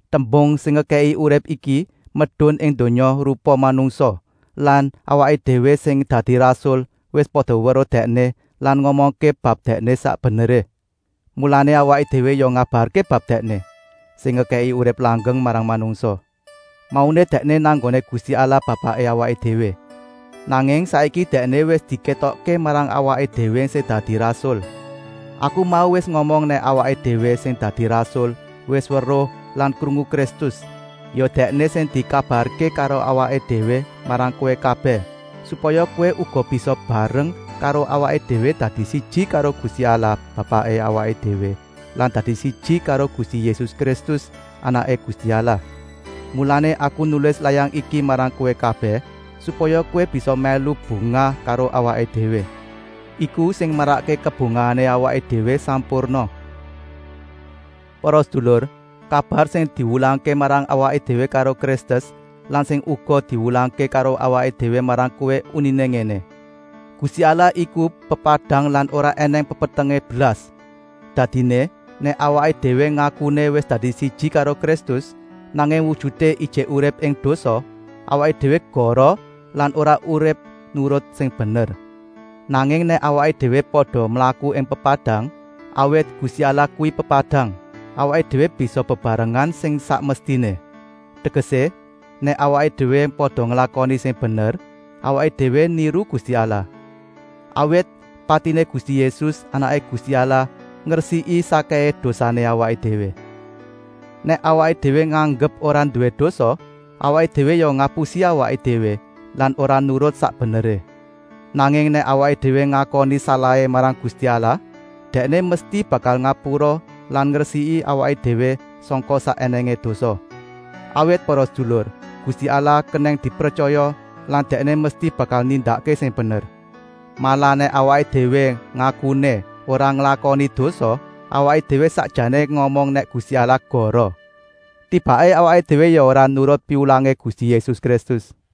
Tembung sing ngekèki urip iki medun ing donya rupa manungsa lan awaké déwé sing dadi rasul wis pada weruh Dèkné lan ngomongké bab Dèkné sak beneré. Mulané awaké déwé ya ngabarké bab Dèkné, sing ngekèki urip langgeng marang manungsa. Mauné Dèkné nang nggoné Gusti Allah Bapaké awaké déwé, nanging saiki Dèkné wis dikétokké marang awaké déwé sing dadi rasul. Aku mau wis ngomong nèk awaké déwé sing dadi rasul wis weruh lan krungu Kristus, ya Dèkné sing dikabarké karo awaké déwé marang kowé kabèh, supaya kowé uga bisa bareng karo awaké déwé dadi siji karo Gusti Allah Bapaké awaké déwé lan dadi siji karo Gusti Yésus Kristus, Anaké Gusti Allah. Mulané aku nulis layang iki marang kowé kabèh, supaya kowé bisa mèlu bungah karo awaké déwé. Iku sing marakké kabungahané awaké déwé sampurna. Para sedulur, kabar sing diwulangké marang awaké déwé karo Kristus lan sing uga diwulangké karo awaké déwé marang kowé uniné ngéné: “Gusti Allah iku pepadang lan ora ènèng pepetengé blas.” Dadiné, nèk awaké déwé ngakuné wis dadi siji karo Kristus, nanging wujuté ijik urip ing dosa, awaké déwé goroh lan ora urip nurut sing bener. Nanging nèk awaké déwé pada mlaku ing pepadang, awit Gusti Allah kuwi pepadang, awaké déwé bisa bebarengan sing sak mestiné. Tegesé, nèk awaké déwé pada nglakoni sing bener, awaké déwé niru Gusti Allah. Awit patiné Gusti Yésus, Anaké Gusti Allah, ngresiki sakkèhé dosané awaké déwé. Nèk awaké déwé nganggep ora nduwé dosa, awaké déwé ya ngapusi awaké déwé lan ora nurut sak beneré. Nanging nèk awaké déwé ngakoni salahé marang Gusti Allah, Dèkné mesti bakal ngapura lan ngresiki awaké déwé sangka sak ènèngé dosa. Awit para sedulur, Gusti Allah kenèng dipretyaya lan Dèkné mesti bakal nindakké sing bener. Malah nèk awaké déwé ngakuné ora nglakoni dosa, awaké déwé sakjané ngomong nèk Gusti Allah goroh. Tibaké awaké déwé ya ora nurut piwulangé Gusti Yésus Kristus.